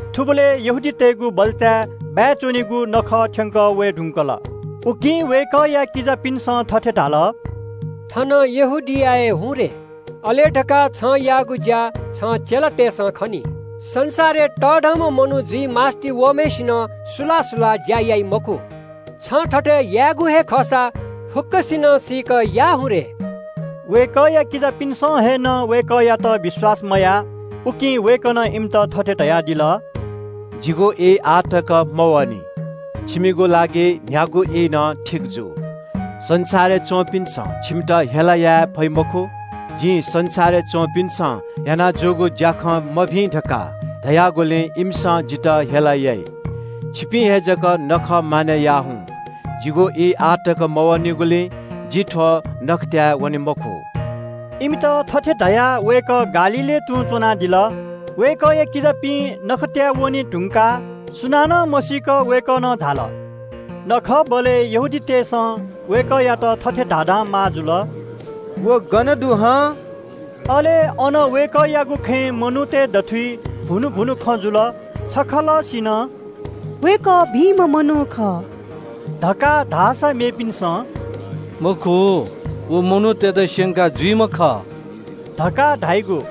थुबलय् यहूदीतय्‌गु बल्‍चाबाय्‌या नखः थ्‍यंकः वये धुंकल। उकिं वय्‌कःया किजापिन्‍सं थथे धाल – “थनं यहूदियाय् झासँ। अले छिं याःगु ज्‍या छिकपिनि चेलातय्‌सं नं खनी। संसारय् तःधंम्‍ह मनू जुइ मास्‍ति वःम्‍हय्‌सिनं सुलाः सुलाः ज्‍या याइ मखु। छिं थथे यायेगु हे खःसा फुक्‍कसिनं सीकेमा।” वय्‌कःया किजापिन्‍सं हे नं वय्‌कःयात विश्‍वास मयाः। उकिं वय्‌कलं इमित थथे धयादिल – “जिगु ई आः तक मवःनि। छिमिगु लागि न्‍ह्यागु ई नं ठीक जू। संसारय् च्‍वंपिन्‍सं छिमित हेला याये फइ मखु। जिं संसारय् च्‍वंपिन्‍सं याना जूगु ज्‍याखँ मभिं धकाः धयागुलिं इमिसं जितः हेला याइ। छिपिं हे जक नखः मानय् याः हुँ। जिगु ई आः तक मवःनिगुलिं जि थ्‍व नखःतय् वने मखु।” इमित थथे धयाः वय्‌कः गालीलय् तुं च्‍वनादिल। वय्‌कःया किजापिं नखःतय् वने धुंकाः सुनानं मसीक वय्‌कः नं झाल। नखःबलय् यहूदीतय् नायःतय्‌सं वय्‌कःयात थथे धाधां माः जुल – “व मनू गन दु हं?” अले अन वय्‌कःयागु खँय् मनूतय् दथुइ भुनु भुनु खँ जुल। छखलःसिनं “वय्‌कः भिंम्‍ह मनू खः” धकाः धाःसा मेपिन्‍सं “मखु, व मनूतय्‌त स्‍यंका जुइम्‍ह खः” धकाः धाइगु।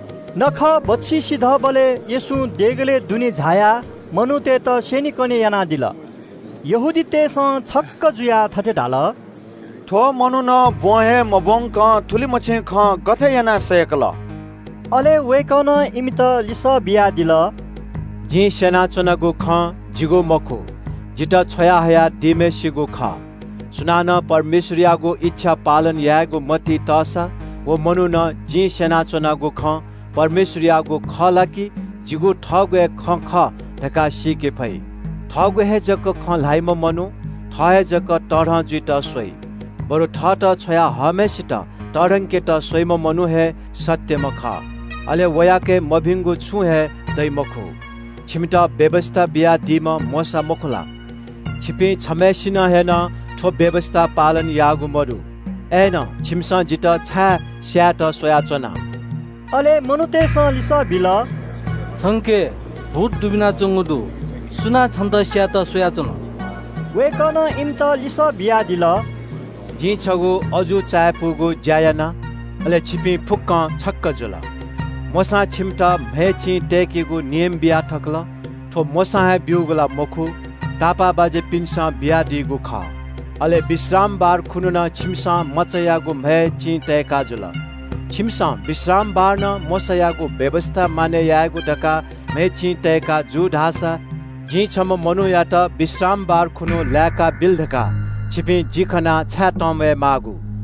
नखः बच्‍छि सिधःबलय् येशूं देगलय् झायाः मनूतय्‌त स्‍यनेकने यानादिल। नायःतय्‌सं छक्‍क जुयाः थथे धाल – “थ्‍व मनुखं ब्‍वँ हे मब्‍वंकं थुलिमछि खँ गथे यानाः सय्‌कल?” अले वय्‌कलं इमित लिसः बियादिल – “जिं स्‍यनाच्‍वनागु खँ जिगु मखु, जितः छ्वया हयादीम्‍हय्‌सित खः। सुनानं परमेश्‍वरयागु इच्‍छा पालन यायेगु मतिइ तःसा व मनुखं जिं स्‍यनाच्‍वनागु खँ परमेश्‍वरयागु खः ला कि जिगु थःगु हे खँ खः धकाः सीके फइ। थःगु हे जक खँ ल्‍हाइम्‍ह मनू थः हे जक तःधं जुइत स्‍वइ। बरु थःत छ्वया हःम्‍हय्‌सित तःधंकेत स्‍वइम्‍ह मनू हे सत्‍यम्‍ह खः। अले वयाके मभिंगु छुं हे दइ मखु। छिमित व्‍यवस्‍था बियादीम्‍ह मोशा मखु ला? छिपिं छम्‍हय्‌सिनं हे नं थ्‍व व्‍यवस्‍था पालन याःगु मदु। अय्‌नं छिमिसं जितः छाय् स्‍यायेत स्‍वयाच्‍वना?” अले मनूतय्‌सं लिसः बिल – “छंके भूत दुबिनाच्‍वंगु दु। सुनां छन्‍त स्‍यायेत स्‍वयाच्‍वन?” वय्‌कलं इमित लिसः बियादिल – “जिं छगू अजू चायापुगु ज्‍या याना, अले छिकपिं फुक्‍कं छक्‍क जुयादिल। मोशां छिकपिन्‍त म्‍हय् चिं तय्‌केगु नियम बिया थकल। थ्‍व मोशां हे ब्‍यूगु ला मखु, तापाःबाज्‍यापिन्‍सं बियादीगु खः। अले विश्रामबार खुन्‍हु नं छिकपिन्‍सं मचायागु म्‍हय् चिं तय्‌का जुल। छिकपिन्‍सं विश्रामबार नं मोशायागु व्‍यवस्‍था मानय् यायेगु धकाः म्‍हय् चिं तय्‌का जू धाःसा जिं छम्‍ह मनूयात विश्रामबार खुन्‍हु लाय्‌काबिल धकाः छिकपिन्‍स जि खनाः छाय् तंम्‍वयादी माःगु?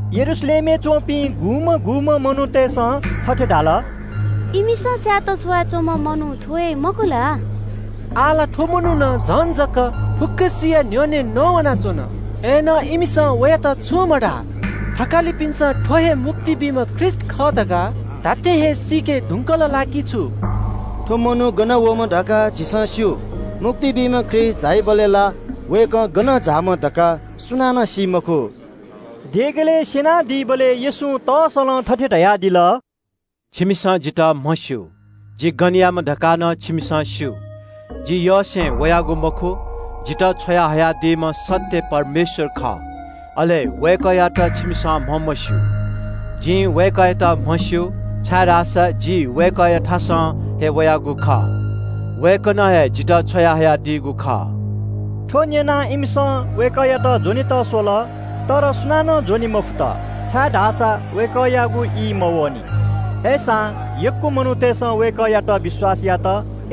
यरूशलेमय् च्‍वंपिं गुम्‍हं गुम्‍हं मनूतय्‌सं थथे धाल – “इमिसं स्‍यायेत स्‍वया च्‍वंम्‍ह मनू थ्‍व हे, मखु ला? आः ला थ्‍व मनुखं झन जक फुक्‍कसिया न्‍ह्यःने नवानाच्‍वन। अय्‌नं वयात सुनां छुं मधाः। नायःतय्‌सं थ्‍व हे मुक्ति बीम्‍ह ख्रीष्‍ट खः धकाः धात्‍थें हे सीके धुंकल ला कि छु? थ्‍व मनू गनं वःम्‍ह धकाः झीसं स्‍यू। मुक्ति बीम्‍ह ख्रीष्‍ट झाइबलय् ला वय्‌कः गनं झाःम्‍ह धकाः सुनानं सी मखु।” देगलय् स्‍यनादीबलय् येशूं तस्‍सलं थथे धयादिल – “छिकपिन्‍सं जितः म्‍हस्‍यू, जि गनयाम्‍ह धकाः नं छिकपिन्‍सं स्‍यू। जि थःयसें वयागु मखु, जितः छ्वयाहयादीम्‍ह सत्‍य परमेश्‍वर खः, छिकपिन्‍सं धाःसा वय्‌कःयात म्‍हमस्‍यू। जिं वय्‌कःयात म्‍हस्‍यू, छाय्‌धाःसा जि वय्‌कःयाथासं हे वयागु खः। वय्‌कलं हे जितः छ्वयाहयादीगु खः।” थ्‍व न्‍यनाः इमिसं वय्‌कःयात ज्‍वनेत स्‍वल। तर सुनानं ज्‍वने मफुत, छाय्‌धाःसा वय्‌कःयागु ई मवःनि। अय्‌सां यक्‍व मनूतय्‌सं वय्‌कःयात विश्‍वास यात।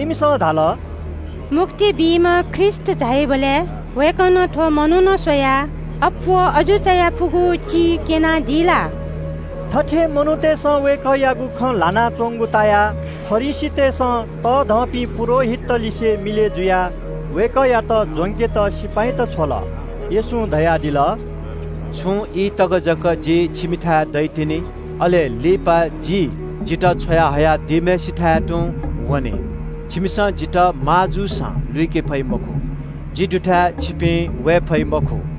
इमिसं धाल – “मुक्ति बीम्‍ह ख्रीष्‍ट झाइबलय् वय्‌कलं थ्‍व मनुखं स्‍वयाः अप्‍वः अजू चायापुगु चिं क्‍यनादी ला?” थथे यक्‍व मनूतय्‌सं वय्‌कःयागु खँ ल्‍हानाच्‍वंगु तायाः फरिसीतय्‌सं तःधंपिं पुजाहारीतलिसे मिलय् जुयाः वय्‌कःयात ज्‍वंकेत देगःया सिपाइँत छ्वल। येशूं इमित धयादिल – “छुं ई तक जक जि छिमिथाय् दइतिनि, अले लिपा जि जितः छ्वया हयादीम्‍हय्‌सिथाय् तुं वने। छिकपिन्‍सं जितः माः जूसां लुइके फइ मखु। जि दुथाय् छिकपिं वये फइ मखु।”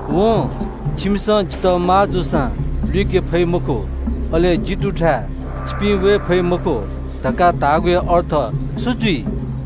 वं ‘छिकपिन्‍सं जितः माः जूसां लुइके फइ मखु’ अले ‘जि दुथाय् छिकपिं वये फइ मखु’ धकाः धाःगुया अर्थ छु जुइ?”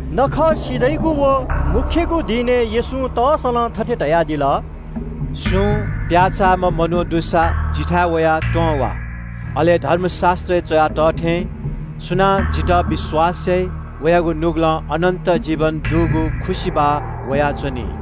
नखः सिधइगु व मू दिनय् येशूं दनाः तस्‍सलं थथे धयादिल – “सुं प्‍याःचाःम्‍ह मनू दुसा जिथाय् वयाः त्‍वँ वा। अले धर्मशास्‍त्रय् च्‍वया तः थें – सुनां जितः विश्‍वास याइ, वयागु नुगलं अनन्‍त जीवन दुगु खुसिबाः वयाच्‍वनी।”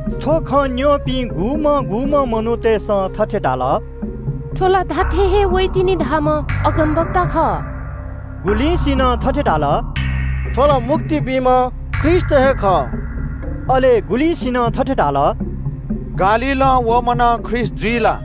थ्‍व खँ न्‍यंपिं गुम्‍हं गुम्‍हं मनूतय्‌सं थथे धाल – “थ्‍व ला धात्‍थें हे वइतिनि धाःम्‍ह अगमवक्ता खः।” गुलिंसिनं थथे धाल – “थ्‍व ला मुक्ति बीम्‍ह ख्रीष्‍ट हे खः।” अले गुलिंसिनं थथे धाल – “गालीलं वःम्‍ह नं ख्रीष्‍ट जुइ ला?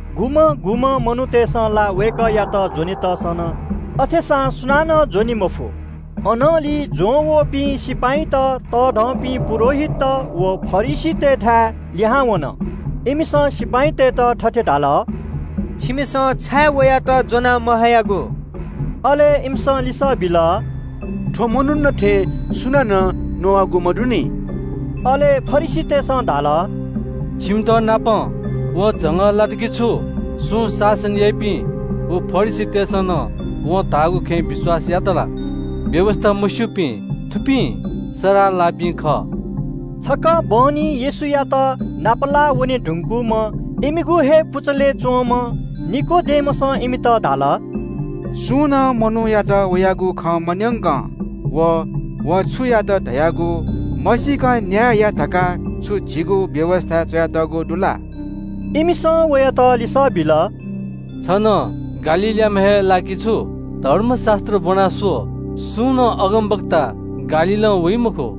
गुम्‍हं गुम्‍हं मनूतय्‌सं ला वय्‌कःयात ज्‍वनेत स्‍वल, अथेसां सुनानं ज्‍वने मफु। अनंलि ज्‍वंवःपिं सिपाइँत तःधंपिं पुजाहारीत व फरिसीतय्‌थाय् लिहां वन। इमिसं सिपाइँतय्‌त थथे धाल – “छिमिसं छाय् वयात ज्‍वना महयागु?” अले इमिसं लिसः बिल – “थ्‍व मनुखं थें सुनानं नवाःगु मदुनि।” अले फरिसीतय्‌सं धाल – “छिमितनापं वं झंगः लात कि छु? सुं शासकत व फरिसीतय्‌सं नं वं धाःगु खँय् विश्‍वास यात ला? व्‍यवस्‍था मस्‍यूपिं थुपिं सराः लाःपिं खः।” छकः बहनी येशूयात नापलाः वने धुंकूम्‍ह इमिगु हे पुचलय् च्‍वंम्‍ह निकोदेमसं इमित धाल – “छु झीगु व्‍यवस्‍थां सुं मनूयात वयागु खँ मन्‍यंकं व वं छु यात धयागु मसीकं न्‍याय याइ ला?” इमिसं वयात लिसः बिल – “छ नं गालीलयाम्‍ह हे ला कि छु? धर्मशास्‍त्र ब्‍वनाः स्‍व, सुं नं अगमवक्ता गालीलं वइ मखु।”